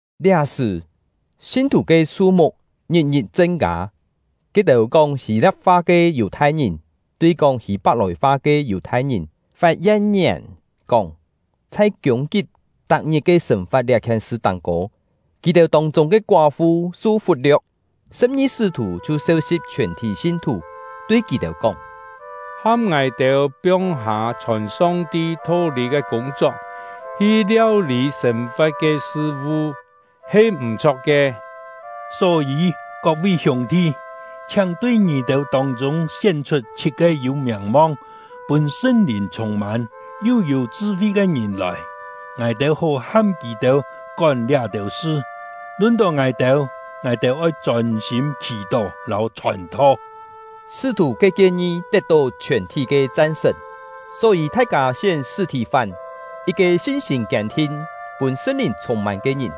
Liá-sṳ̀, sin-thù ke su-muk ngit-ngit chen-kâ; ke-têu kóng Hî-lia̍p-fa ke Yù-thai-ngìn tui kóng Hî-pak-lòi-fa ke Yù-thai-ngìn fat yen-ngièn, kóng: Chhai kiûng-kip tak-ngit ke sên-fa̍t liá-khien sṳ táng-kô, kì-têu tông-chûng ke koá-fu su fut-lio̍k. Sṳ̍p-ngi sṳ́-thù chhiu seu-si̍p chhiòn-thí sin-thù, tui kì-têu kóng: “Ham ngài-têu piong-hâ chhòn Song-ti tho-lî ke kûng-chok, hi liau-lî sên-fa̍t ke sṳ-vu, he m̀-chho̍k ke. Só-yî, kok-vi hiûng-thi, chhiáng tui ngì-têu tông-chûng sién-chhut chhit-ke yû miàng-mong, pûn Sṳn-Lìn chhûng-mân, yu yû chṳ-fi ke ngìn lòi, ngài-têu hó ham kì-têu kón liá-têu sṳ. Lun-tó ngài-têu, ngài-têu oi chôn-sîm khì-tó lâu chhòn-tho.” Sṳ́-thù ke kien-ngi tet-tó chhiòn-thí ke chan-sṳ̀n. Só-yî thai-kâ sién Sṳ̂-thì-fán, yit-ke sin-sîm kiên-thin, pûn Sṳn-Lìn chhûng-mân ke ngìn;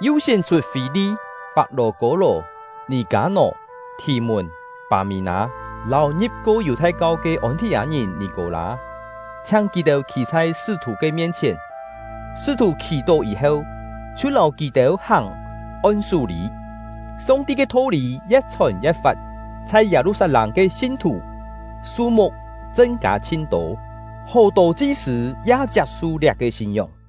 yu sién-chhut Fî-li, Pak-lò-kô-lò, Nì-kâ-nò, Thì-mùn, Pâ-mí-nâ, lâu ngi̍p-ko Yù-thai-kau ke Ôn-thì-â-ngìn Nì-kô-lâ, chhiáng kì-têu khî chhai sṳ́-thù ke mien-chhièn; sṳ́-thù khì-tó yî-heu, chhiu lâu kì-têu hàng on-sú-lî. Song-ti ke tho-lî ye̍t-chhòn ye̍t-fat; chhai Yâ-lu-sat-lâng ke sin-thù, su-muk chen-kâ chhin-tô, hó-tô chi-sṳ̂ ya chiap-su liá-ke sin-ngióng.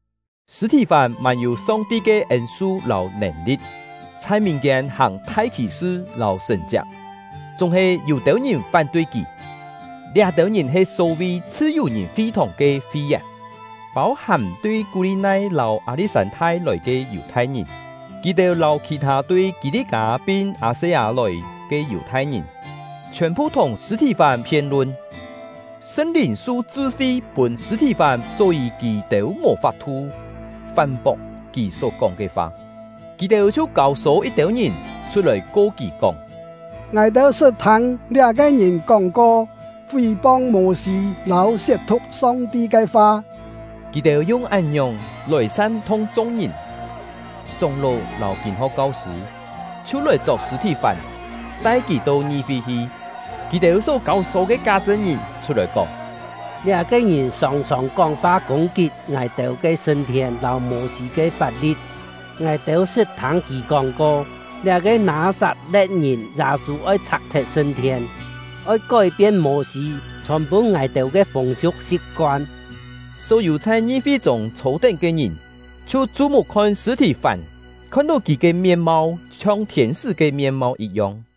Sṳ̂-thì-fán mân-yû Song-ti ke ên-su lâu nèn-li̍t, chhai mìn-kiên hàng thai khì-sṳ lâu sṳ̀n-chiak. Chúng-he yû-têu ngìn fán-tui kì; liá-têu ngìn he só-vi “Chhṳ-yù-ngìn” fi-thòng ke fi-yèn, pâu-hàm tui Kú-li-nai lâu Â-li̍t-sân-thai lòi ke Yù-thai-ngìn. Kì-têu lâu khì-thâ tui Kî-li-kâ pin Â-se-â lòi ke Yù-thai-ngìn, chhiòn-phu thùng Sṳ̂-thì-fán phien-lun. Sṳn-Lìn su chṳ-fi pûn Sṳ̂-thì-fán, só-yî kì-têu mò fap-thu fán-pok kì só kóng ke fa. Kì-têu chhiu kâu-sô yit-têu ngìn chhut-lòi ko kì kóng: “Ngài-têu sṳt thâng liá-ke ngìn kóng-ko fí-pong Mô-sî lâu siet-thu̍k Song-ti ke fa!” Kì-têu yung án-ngiòng lòi san-thung chung-ngìn, chóng-ló lâu kîn-ho̍k kau-sṳ̂, chhiu lòi chok Sṳ̂-thì-fán, tai kì to ngi-fi hi. Kì-têu só kâu-sô ke ká chṳn-ngìn chhut-lòi kóng: “Liá-ke ngìn sòng-sòng kóng-fa kûng-kit ngài-têu ke sṳn-thien lâu Mô-sî ke fap-li̍t. Ngài-têu sṳt thâng kì kóng-ko: Liá-ke Nâ-sat-le̍t-ngìn Yâ-sû oi chhak-thet sṳn-thien, oi kói-pien Mô-sî chhòn pûn ngài-têu ke fûng-siu̍k si̍p-koan!” Só-yû chhai ngi-fi-chûng chhô-tén ke ngìn chhiu chu-muk khon Sṳ̂-thì-fán, khon-tó kì ke mien-mau chhiong thiên-sṳ́ ke mien-mau yit-yong.